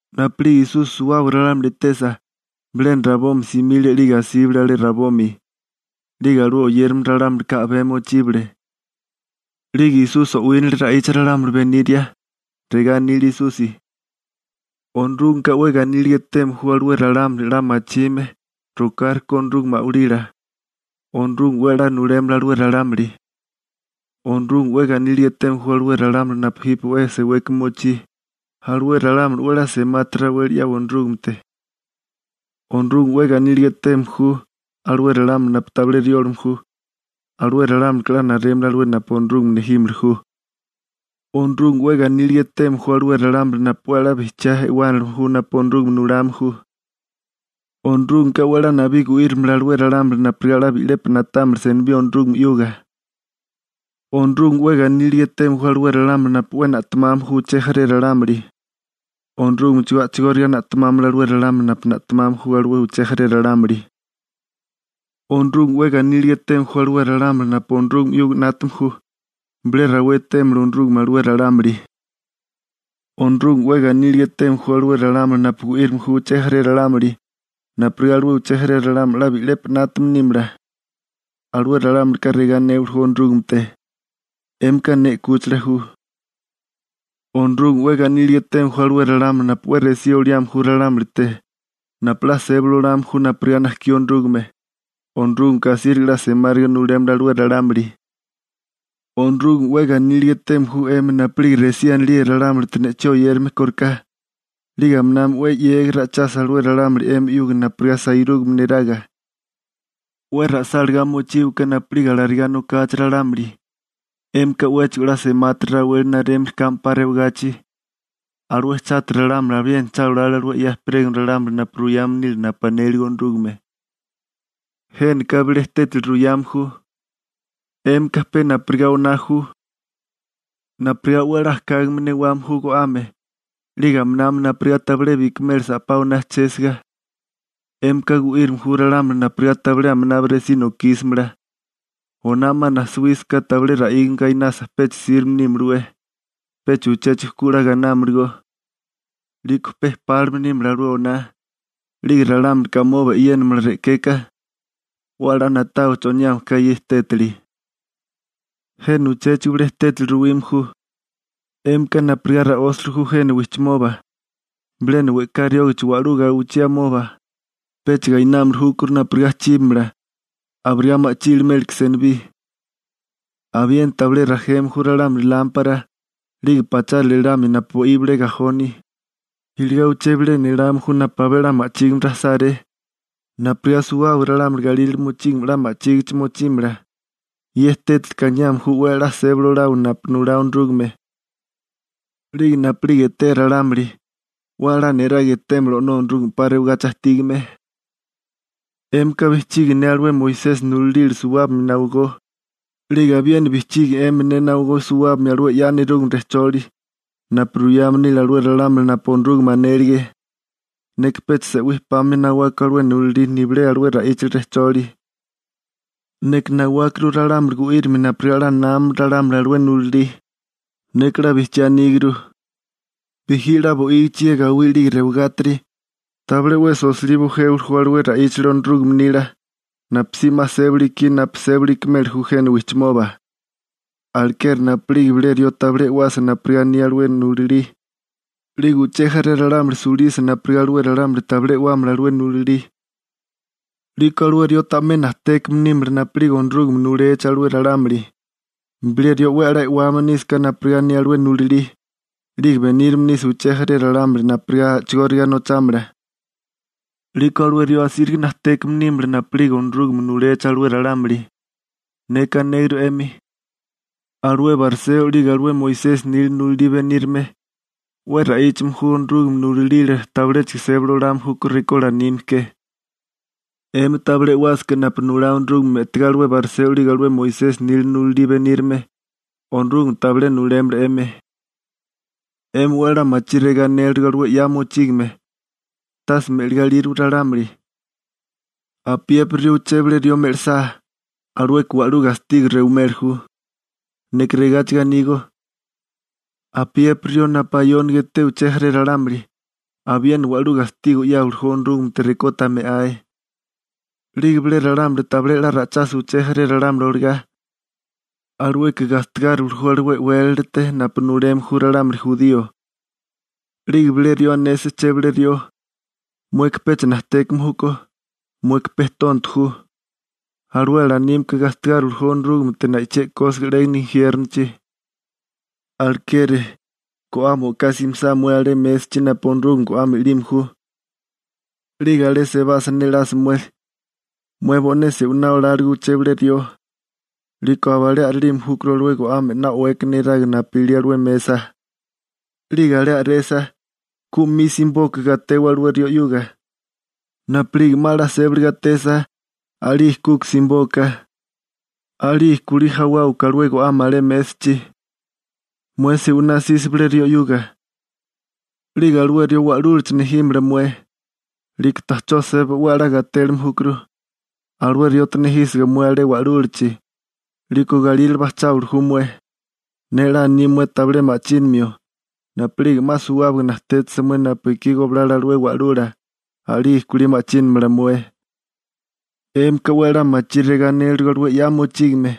Napu'lige Esusi suwábaga ralámuli etesa, bilena rabomi simile 'lige asíbale alé rabomi. 'Lige alué oyérame ralámulika a'bé mochíbale. 'Lige Esusi o'wínale ra'icha ralámuli beniria. Regá anile Esusi: ―Onorúgameka 'we ganíliga eteme ju (yolí ra'íchagaká ‹‹dichoso›› anime chujkú) alué ralámuli 'la machime rokárikó Onorúgame a'walila. Onorúgame 'we a'lá nulémala alué ralámuli. › Onorúgame 'we ganíliga eteme ju alué ralámuli napu jipe 'we seweka mochí, alué ralámuli 'we a'lá semati raweli 'yawa Onorúgamete. › Onorúgame 'we ganíliga eteme ju alué ralámuli napu tabilé riólame ju. Alué ralámulika 'la narémala alué napu Onorúgame nejímili ju. › Onorúgame 'we ganíliga eteme ju alué ralámuli napu 'we a'lá bijchiá e'wánilime ju napu Onorúgame nulame ju. Onorúgameka 'we a'lá nabí gu'írimala alué ralámuli napurigá 'la bi'lepi na'támala senibí Onorúgame 'yuga. › Onorúgame 'we ganíliga eteme ju alué ralámuli napu 'we na'temame ju uché jaré ralámuli. Onorúgamechigó a'chigóriga na'temámala alué ralámuli napu na'temame ju alué uché jaré ralámuli. › Onorúgame 'we ganíliga eteme ju alué ralámuli napu Onorúgame 'yuga 'nátame ju. Bilé rawé etémala Onorúgame alué ralámuli. › Onorúgame 'we ganíliga eteme ju alué ralámuli napu gu'írime ju uché jaré ralámuli, napurigá alué uché jaré ralámuli 'la bi'lepi 'nátame nímala. Alué ralámulika regá anéwali Onorúgamete: «'Émika ne 'kúchila ju.» › Onorúgame 'we ganíliga eteme ju alué ralámuli napu 'we resí oliame ju ralámulite napu 'la sébali olame ju napurigá najkí Onorúgame. Onorúgameka asíriga 'la semáriga nulémala alué ralámuli. › Onorúgame 'we ganíliga eteme ju 'emi napu'lige resí anilíe ralámulite ne'chí oyérame kóriká, 'lige aminami 'we 'yégiga ra'ichasa alué ralámuli 'emi 'yuga napurigá sairúgame neraga. 'We ra'sáligá mochíwaká napu'lige alarigá nokachi ralámuli, 'émika 'wéchigo 'la semátiri raweli narémili kame 'pa rewagachi. Alué chátiri ralámuli abiena cha olale alué 'ya ejperégame ralámuli napu ruyame nílige napu anele Onorúgame. › Jénaka bilé tétali ruyame ju. 'Émika pe napurigá oná ju. Napurigá 'we a'lá ajkágame newame ju go'ame, 'lige aminami napurigá tabilé bikamela sa'pá oná ajchésiga, 'émika gu'írame ju ralámuli napurigá tabilé aminabi resí nokísimala. Oná 'ma najsawísaká tabilé ra'ígame gainasa pecha sirbe nímalawé. Pecha uchéchigo ku 'la gainámalagó. 'Liko pe pálime nímala alué oná, 'lige ralámulika amoba e'yénamala re'keka. 'We a'lá na'tawa choniame ka ye tétali. › Jena uchéchigo bilé tétali ruwime ju. 'Émika napurigá ra'ósali ju jena wijchimoba. Bilena we'ká riógachi wa'lú gawichí amoba, pecha gainámili júkó napurigá chíbamala, abirigá ma'chí iliméleke senibí. Abiena tabilé rajeme ju ralámuli lámpara, 'lige pachárale elamia napu bo'í bilé gajoni, iligá uché bilena elame ju napu abé 'la ma'chígime rajisáré, napurigá suwábaga ralámuli galírale mochígame 'la ma'chígichi mochímala. Ye tétalika aniame ju 'we a'lá sébali olawa napu nulá Onorúgame, 'lige napu'lige etea ralámuli, 'we a'lá niraga etémala O'nó Onorúgame 'pa rewagachi ajtígame. › 'Émika bijchigi ne alué Moisesi nulalila suwábimia nawigó, 'lige abiena bijchigi 'emi ne nawigó suwábimia alué 'ya nerúgame rejcholi, napu ruyame nile alué ralámuli napu Onorúgame anélige. Neka pecha se'wí pamia nawako alué nulalí nibilé alué ra'íchali rejcholi. Neka nawákuru ralámuli gu'írimia napurigá 'la námamala ralámuli alué nulalí. Neka 'la bijchiá aníguru, bijí 'la bo'ígichi ye gawí 'lige rewagátiri, tabilé 'wesi osilí bujéwili ju alué ra'íchali Onorúgame nila, napusí 'ma sébili ikí napu sébili ikimeli ju jena wijchimoba. Alekeri napu'lige bilé rió tabilé e'wasa napurigá aní alué nulalí, 'lige uché jaré ralámuli sulisa napurigá alué ralámuli tabilé e'wámala alué nulalí, 'liko alué rió ta'mé najtékame nímala napu'lige Onorúgame nulechi alué ralámuli. Bilé rió 'we a'lá e'wame nísaká napurigá aní alué nulalí, 'lige benírame nisa uché jaré ralámuli napurigá a'chigóriga nochámala, 'liko alué rió asíriga najtékame nímala napu'lige Onorúgame nulechi alué ralámuli. Neka anéguru 'emi: Alué bariseo 'lige alué Moisesi nila nulalila benírame, 'we ra'íchame ju Onorúgame nulalila tabiléchigo sébali olame júkó rekó lanime ke. 'Emi tabilé e'wásaká napu nulá Onorúgame me'tagá alué bariseo 'lige alué Moisesi nila nulalí benírame, Onorúgame tabilé nulémala 'emi. › 'Emi 'we a'lá machí regá anélirigo alué 'ya mochígame: «Tase me'ligá ilírowa ralámuli. Apiépiri rió uché bilé rió me'lisá, alueka wa'lú gastigo rewimeli ju.» Neka regáchigo anígó: Apiépiri rió napu ayóniga eté uché jaré ralámuli, abiena wa'lú gastigo 'yáwili ju Onorúgamete rekó ta me'ae. 'Lige bilé ralámuli tabilé 'la ra'ichasa uché jaré ralámuli olagá, alueka gastigáriwili ju alué e'wélalate napu nuleme ju ralámuli jurío. 'Lige bilé rió anesa chebilé rió: «Mueka pecha najtékame júkó, mueka pe tonto ju», alué alanímeká gastigáriwili ju Onorúgamete na'ichí e'kósiga 'légana injiérnochi. › Alekeri, go'ame o'ká simisá mué alé mésachi napu Onorúgame go'ame i'lime ju, 'lige alé sebasa nelasa mué, mué bo'né se'winá oláligo uché bilé rió, 'liko abalé a'rélime júkuru alué go'ame 'na o'weka neraga napu ilí alué mesa. 'Lige alé a'resa, ku 'mi simibóká gatewa alué rió 'yuga. Napu'lige 'ma 'la sébali gatesa, a'lige kuka simibóká, a'lige kulí jawáwaká alué go'ame alé mésachi. › Mué se'winá 'sisa bilé rió 'yuga, 'lige alué rió wa'lúlachi nejímala mué, 'liko ta'chó seba 'we a'lá gatélime júkuru. Alué riote nejísiga mué alé wa'lúlachi, 'liko galírale bajcháwili ju mué. Ne 'la aní mué tabilé ma'chínimio. Napu'lige 'ma suwábaga najtétasa mué napu ekí goblala alué wa'lula, a'lige kulí ma'chínamala mué. › 'Émika 'we a'lá machí regá anélirigo alué 'ya mochígame: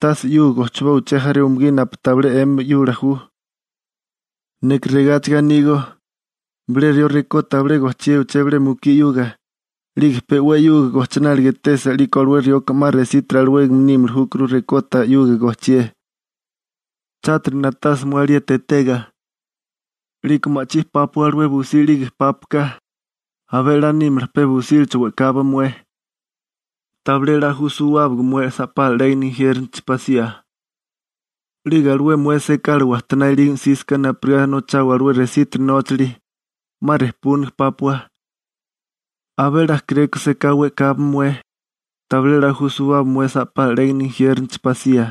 «Tase 'yuga gochiboa uché jaré umugí alué napu tabilé 'emi 'yula ju.» Neka regáchigo anígó: Bilé rió rekó tabilé gochié uché bilé mukí 'yuga, 'lige pe 'we 'yuga gochináliga etesa 'liko alué rioka 'ma resítiri alawégame nímili júkuru rekó ta 'yuga gochié. › Chátiri na'tasa mué alieti etega, 'liko ma'chí pápua alué busí 'lige pápuaká. Abé 'la nímala pe busílacho we'kawa mué, tabilé 'la ju suwábaga mué sa'pala 'légana injiérnochi pasía. 'Lige alué mué sekala wajtoná ilígame 'sísaká napurigá nochawa alué resítiri nóchali, 'ma rejpúniga pápua. Abé 'la kéréko seká we'kawa mué, tabilé 'la ju suwábaga mué sa'pala 'légana injiérnochi pasía. ›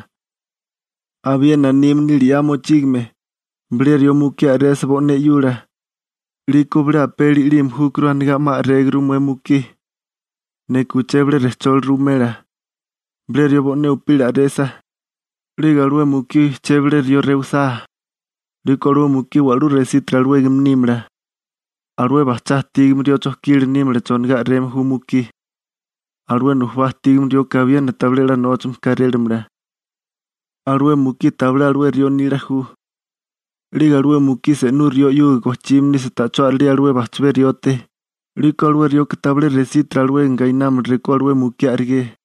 Abiena anime nile 'ya mochígame: «Bilé rió mukí a'resa bo'né 'yula, 'liko bilé apeli i'lime júkuru anigá 'ma a'réguru mué mukí.» Neka uché bilé rejcholi ruwimela. Bilé rió bo'né upila a'resa, 'lige alué mukí uché bilé rió rewisá, 'liko alué mukí wa'lú resítiri alawégame nímala. Alué bajchá ajtígame rió chojkila nímala chonigá a'reme ju mukí. Alué nujubá ajtígame rioka abiena tabilé 'la nóchame kárélamala. Alué mukí tabilé alué rió nila ju. 'Lige alué mukí se'nú rió 'yuga gochime nisa ta'chó a'relía alué bajchabé riote, 'liko alué rioka tabilé resítiri alawégame gainámala rekó alué mukí a'rigé. ›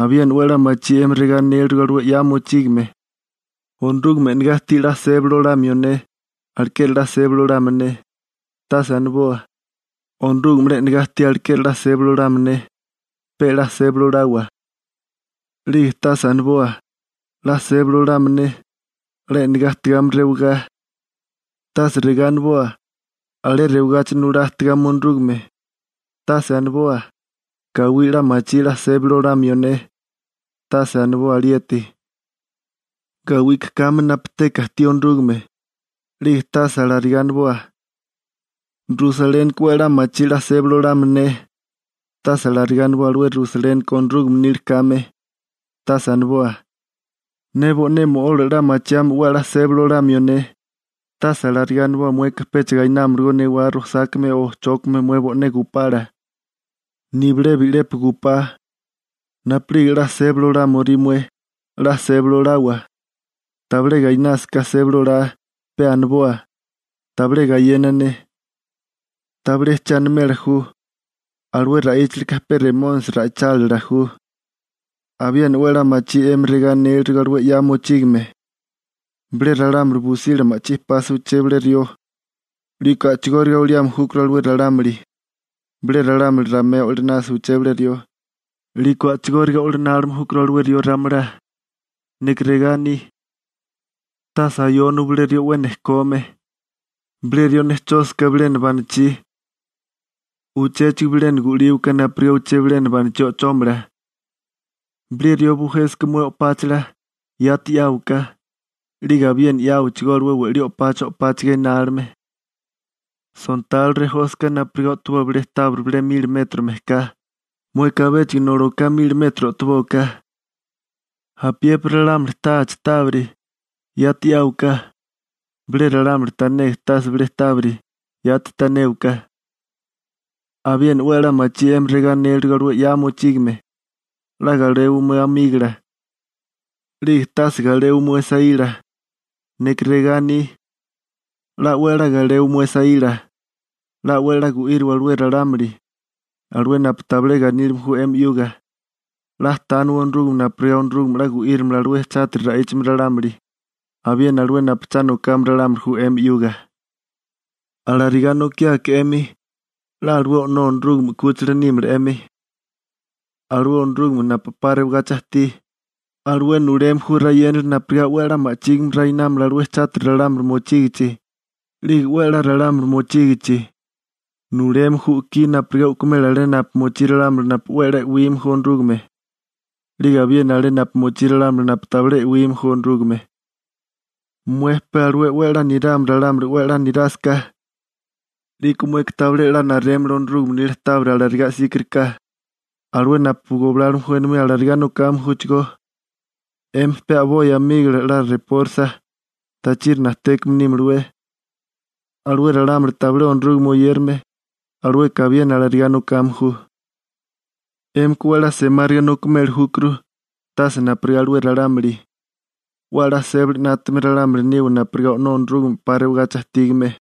Abiena 'we a'lá machí 'emi regá anélirigo alué 'ya mochígame: «Onorúgame e'negá ajtí 'la sébali olamio ne, alekeri 'la sébali olámala ne.» Tase aniboa: «Onorúgame 'la e'negá ajtí alekeri 'la sébali olámala ne.» Pe 'la sébali olawa. 'Lige tase aniboa: «'La sébali olámala ne, 'la e'negá ajtigame rewagá.» Tase regá aniboa: «Alé rewagachi nulá ajtigame Onorúgame.» Tase aniboa: «Gawí 'la machí 'la sébali olamio ne.» Tase aniboa alieti, gawika kame napu teka ajtí Onorúgame. 'Lige tase alarigá aniboa: «Rusalénika 'we a'lá machí 'la sébali olámala ne.» Tase alarigá aniboa alué Rusalénika Onorúgame nila kame. Tase aniboa: «Ne bo'né mo'ola 'la machiame 'we a'lá sébali olamio ne.» Tase alarigá aniboa mueka pecha gainámalagó newá rosákame o chókame mué bo'né gupala, nibilé bi'lepi gupá. Napu'lige 'la sébali olámorisá mué, 'la sébali olawa. Tabilé gainásaká sébali olá, pe aniboa: «Tabilé ikíromala ne.» Tabilé siné 'yégili rupoa. 'Yégiliká pe Remónisi ra'ichálila ju. › Abiena 'we a'lá machí 'emi regá aníligo alué 'ya mochígame: «Bilé ralámuli busila ma'chí pasa uché bilé rió, 'liko a'chigóriga oliame júkuru alué ralámuli. Bilé ralámuli ramé o'linasa uché bilé rió, 'liko a'chigóriga o'linálime júkuru alué rió ramalá.» Neka regá aní: «Tase ayóniwa bilé rió 'we nejkome. Bilé rió nejchósaká bilena banichí, uchéchigo bilena gu'líwaká napurigá uché bilena banachí o'chómala. Bilé rió bujénasaká mué o'páchala, yati 'yáwaká, 'lige abiena 'yáwachigó alué we'lí o'pacha o'páchiga inálime. Sontalo rejósaká napurigá o'toboa bilé tábiri bilé mili metro mejká, mueka abéchigo noli oká mili metro o'tobóká. Apiépiri ralámuli táachi tábiri, yati 'yáwaká. Bilé ralámuli tanega tásaká bilé tábiri, yati tanéwaká.» › Abiena 'we a'lá machí 'emi regá anélirigo alué 'ya mochígame: «'La galewa mué amígola, 'lige tase galewa mué saíla.» Neka regá aní: 'La 'we a'lá galewa mué saíla. 'La 'we a'lá gu'íriwa alué ralámuli, alué napu tabilé ganílime ju 'emi 'yuga. 'La tániwa Onorúgame napurigá Onorúgame 'la gu'írimala alué chátiri ra'íchame ralámuli, abiena alué napu cha nokame ralámuli ju 'emi 'yuga. Alarigá nokiáká 'emi, 'la alué O'nó Onorúgame 'kúchila nímala 'emi, alué Onorúgame napu 'pa rewagachi ajtí, alué nuleme ju rayénali napurigá 'we a'lá ma'chígime rainámala alué chátiri ralámuli mochígichi, 'lige 'we a'lá ralámuli mochígichi. Nuleme ju u'kí napurigá u'kumela alé napu mochí ralámuli napu 'la e'wime ju Onorúgame, 'lige abiena alé napu mochí ralámuli napu tabilé e'wime ju Onorúgame. Mué pe alué 'we a'lá nirame ralámuli 'we a'lá nirásaká, 'liko mueka tabilé 'la narémala Onorúgame nila tábiri alarigá 'síkariká. Alué napu goblálome ju enomí alarigá nokame júchigó. 'Emi pe a'boi amígola 'la repórisa, tachiri najtékame nímalawé. Alué ralámuli tabilé Onorúgame oyérame, alueka abiena alarigá nokame ju. 'Émika 'we a'lá semáriga nokimeli júkuru, tase napurigá alué ralámuli. 'We a'lá sébali 'nátame ralámuli niwa napurigá O'nó Onorúgame 'pa rewagachi ajtígame.